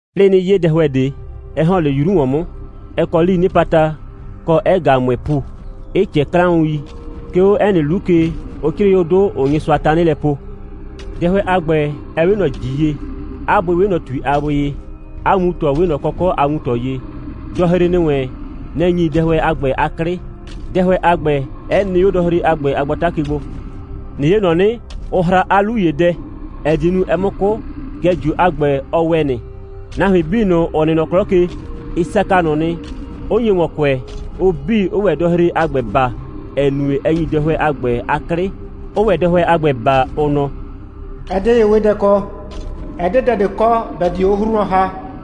'Plɩɩ 'nɩ 'ye dɛhʋɛ ꞊de, 'ɛ ‑hɔn 'le 'yru ‑wɔn 'mʋ. Ɛ kɔ 'lii 'nɩpata, kɔ, 'ɛ ꞊gaa ꞊mʋɩɩ ‑pu, 'ɩ ꞊cɛɛ 'klaʋn.i. 'Ke 'o 'ɛ nɩ 'lu ke, ʋ 'crɩɩ 'o 'dʋ, ‑ʋʋ Nyɩsʋa tanɩ lɛ poo. Dɛhʋɛ a ‑gbɛ, ɛ 'we ꞊nɔ ‑ji ye. 'A bʋɩ 'we ꞊nɔ ‑tui a bʋɩ ye. 'A wuntɔ 'we ꞊nɔ kɔkɔ' a wuntɔ ye. Dɔhre ‑nɩ wɛn, nɛ‑ ‑nyi dɛhʋɛ a ‑gbɛ 'a 'klɩ, dɛhʋɛ a ‑gbɛ 'ɛ nɩ 'o dɔhre a ‑gbɛ a gbata ke gbo. ꞊Nɩ 'ye, ‑nɔ 'nɩ, ʋ hra 'a 'lu ‑ye dɛ, ‑ɛ die nu, ɛ 'mʋ 'kʋ, kɛɛ, ꞊jio a ‑gbɛ, ɔ ‑wɛ nɩ. Nahuin 'bii ꞊nʋ, ‑ʋ nɩ nɔ 'klɔ ke, ɩ saka ꞊nʋ nɩ, 'ʋ nye ‑wɔn kʋɛ, ʋ 'bii, 'ʋʋ ‑wɛ dɔhre a ‑gbɛ baa, ‑ɛ nue, ɛ ‑nyi dɛhʋɛ a ‑gbɛ 'a 'klɩ, 'ʋʋ ‑wɛ dɛhʋɛ a ‑gbɛ baa, ʋ nɔ: «Ɛ 'de ye'wedɛ kɔ. Ɛ 'de dɛ ꞊de kɔ, ‑bɛ die 'o 'hru wlɔn ‑ha.»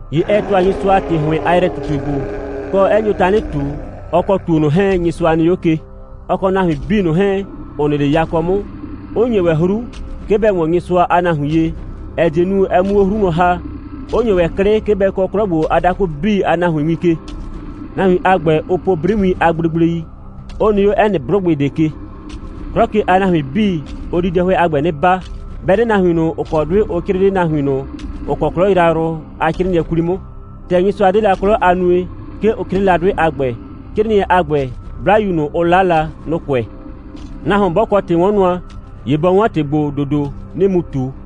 ‑Ye ɛ ‑tʋa Nyɩsʋa ‑tɩ ‑hʋɩn a yrɛ꞊tutue gbo, kɔ, 'ɛ nyo tanɩ ꞊tu, ɔ kɔ ‑tuo ꞊nʋ 'hɛɛn, Nyɩsʋa nɩ 'o ke, ɔ kɔ nahuin 'bii ꞊nʋ 'hɛɛn, ‑ʋ nɩ 'le yakɔ 'mʋ, 'ʋ ‑nye ‑wɛ 'hru, 'ke bɛ ‑wɔn Nyɩsʋa a nahuin ye, ‑ɛ die nu, ɛ 'mu 'o 'hru wlɔn ‑ha, 'ʋ ‑nye ‑wɛ 'klɩ, 'ke bɛ kɔɔ 'klɔ ‑gbo a dakʋ 'bii a nahuin win ke. Nahuin a ‑gbɛ, ʋʋ po 'briwiin a gblegblei, 'ʋ nɩ 'o 'ɛ nɩ 'blʋgbɩ ꞊de ke. 'Klɔ ke a nahuin 'bii, ʋ di dɛhʋɛ a ‑gbɛ 'nɩ baa, 'bɛ 'de nahuin ꞊nʋ, ‑ʋ kɔ 'dʋɩ ʋ 'crɩɩ 'le nahuin ꞊nʋ, ‑ʋ kɔ 'klɔ yrayrʋ a 'crɩɩnɩɛ 'kwli 'mʋ. ‑Tɛ Nyɩsʋa 'de la 'klɔ a nue, 'ke ʋ 'crɩɩ la 'dʋɩ a ‑gbɛ. 'Crɩɩnɩɛ a ‑gbɛ, 'Blayu ꞊nʋ, ʋ 'la la, nʋ‑ kʋɛ. Nahuon 'bɔ kɔ ‑tɩ'wɔnnʋa, ‑ye bɔ 'wɔn ‑tɩ ‑gbo ‑dodo, 'nɩɩ mu ꞊tu: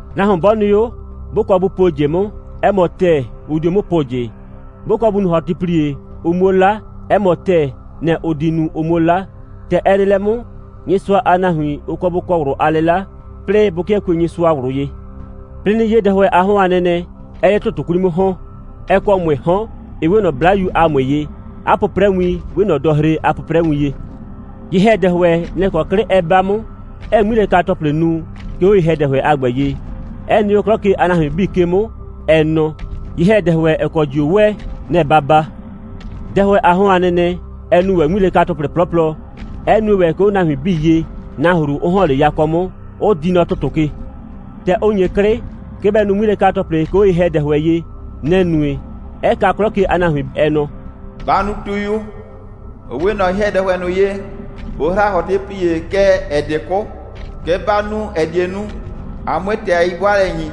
Nahuon 'bɔ nɩ 'o, 'bʋ kɔ bʋ puo ꞊jɩ 'mʋ, 'ɛ mɔ ‑tɛɛ, ʋ dio 'mʋ po ꞊jɩ. 'Bʋ kɔ bʋ nu ‑hɔtɩplie, ʋ 'muo 'la, 'ɛ mɔ ‑tɛɛ, nɛ‑ ʋ di nu, ʋ 'muo 'la. ‑Tɛ ɛ nɩ lɛ 'mʋ, Nyɩsʋa a nahuin, ʋ kɔ bʋ kɔ ꞊wlʋ a 'lɩla, 'plɩɩ bʋ 'kɩɛ kue Nyɩsʋa ꞊wlʋ ye. 'Plɩɩ 'nɩ 'ye dɛhʋɛ a 'hɔn a nɛnɛ, 'ɛɛ 'le ‑tʋtʋ 'kwli 'mʋ ‑hɔn. Ɛ kɔ ꞊mʋɩɩ 'hɔn, 'ɩ 'we ꞊nɔ 'blayu a ꞊mʋɩ ye, 'a 'pʋprɛwin 'we ꞊nɔ dɔhre a 'pʋprɛwin ye. Ye‑hɛdɛhʋɛ, nɛ‑ kɔ 'klɩ ɛ 'ba 'mʋ, 'ɛɛ 'ŋmilɛka‑tɔplɩ nu, 'ke 'o ye‑hɛdɛhʋɛ a ‑gbɛ ye, 'ɛ nɩ 'o 'klɔ ke a nahuin 'bii ke 'mʋ, ɛ nɔ: «Ye‑hɛdɛhʋɛ, ‑ɛ kɔ ꞊jio ‑wɛ, nɛ‑ ba baa.» Dɛhʋɛ a 'hɔn a nɛnɛ, ɛ nu ‑wɛ 'ŋmilɛka‑tɔplɩ 'plɔplɔ, 'ɛ nue ‑wɛ, 'ke 'o nahuin 'bii ye, nahru 'ʋ ‑hɔn 'le yakɔ 'mʋ, 'ʋ di nɔ ‑tʋtʋ ke. ‑Tɛ ʋ ‑nye 'klɩ, 'ke bɛ nu 'ŋmilɛka‑tɔplɩ, 'ke 'o ye‑hɛdɛhʋɛ ye, nɛ‑ nue, 'ɛ kaa 'klɔ ke a nahuin, ɛ nɔ: «Ba nu tuyu, ‑ʋ 'we ꞊nɔ ye‑hɛdɛhʋɛ ꞊nʋ ye, ʋ hra ‑hɔtɩplie, kɛɛ, ‑ɛ 'de 'kʋ. Kɛ ba nu, ‑ɛ die nu, a 'mue ‑tɩ a 'yi'bʋaalɛ ‑nyi,»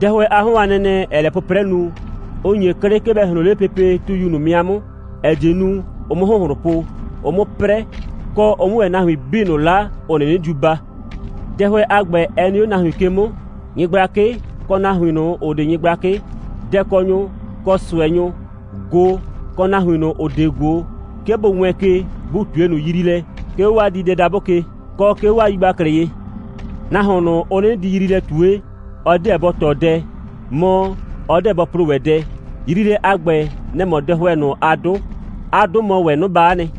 dɛhʋɛ a 'hɔn a nɛnɛ, ‑ɛɛ lɛ 'pʋprɛ nu, 'ʋ ‑nye 'klɩ, 'ke bɛ ꞊hloon 'le pepe tuyu ꞊nʋ 'mɩa 'mʋ, ‑ɛ die nu, ʋ 'mʋ ‑hʋnhlʋn po, ʋ 'mʋ 'prɛ, kɔ, ʋ 'mʋ ‑wɛ nahuin 'bii ꞊nʋ 'la, ‑ʋ 'nɩnɩ diu baa, dɛhʋɛ a ‑gbɛ 'ɛ nɩ 'o nahuin ke 'mʋ, nyɩgblakɩ, kɔ nahuin ꞊nʋ, ‑ʋ 'de nyɩgblakɩ, dɛkɔnyʋ, kɔ ꞊sʋɛnyʋ, ꞊go, kɔ nahuin ꞊nʋ, ‑ʋ 'de ꞊go, 'ke bʋ wɛɛn ke, bʋ ꞊tue ꞊nʋ yriilɛ, 'ke 'o 'waa diidɛdabʋ ke, kɔ, 'ke 'o 'waa yigbaklɩ ye. Nahuon ꞊nʋ, ʋ 'nɩnɩ di yriilɛ ꞊tue, ɔ 'deɛ bɔ ‑tɔ dɛ, mɔ, ɔ 'deɛ bɔ plo ‑wɛ dɛ. Yriilɛ a ‑gbɛ, nɛ‑ mɔ dɛhʋɛ ꞊nʋ a 'dʋ. 'A 'dʋ mɔ ‑wɛ 'noba'a nɩ.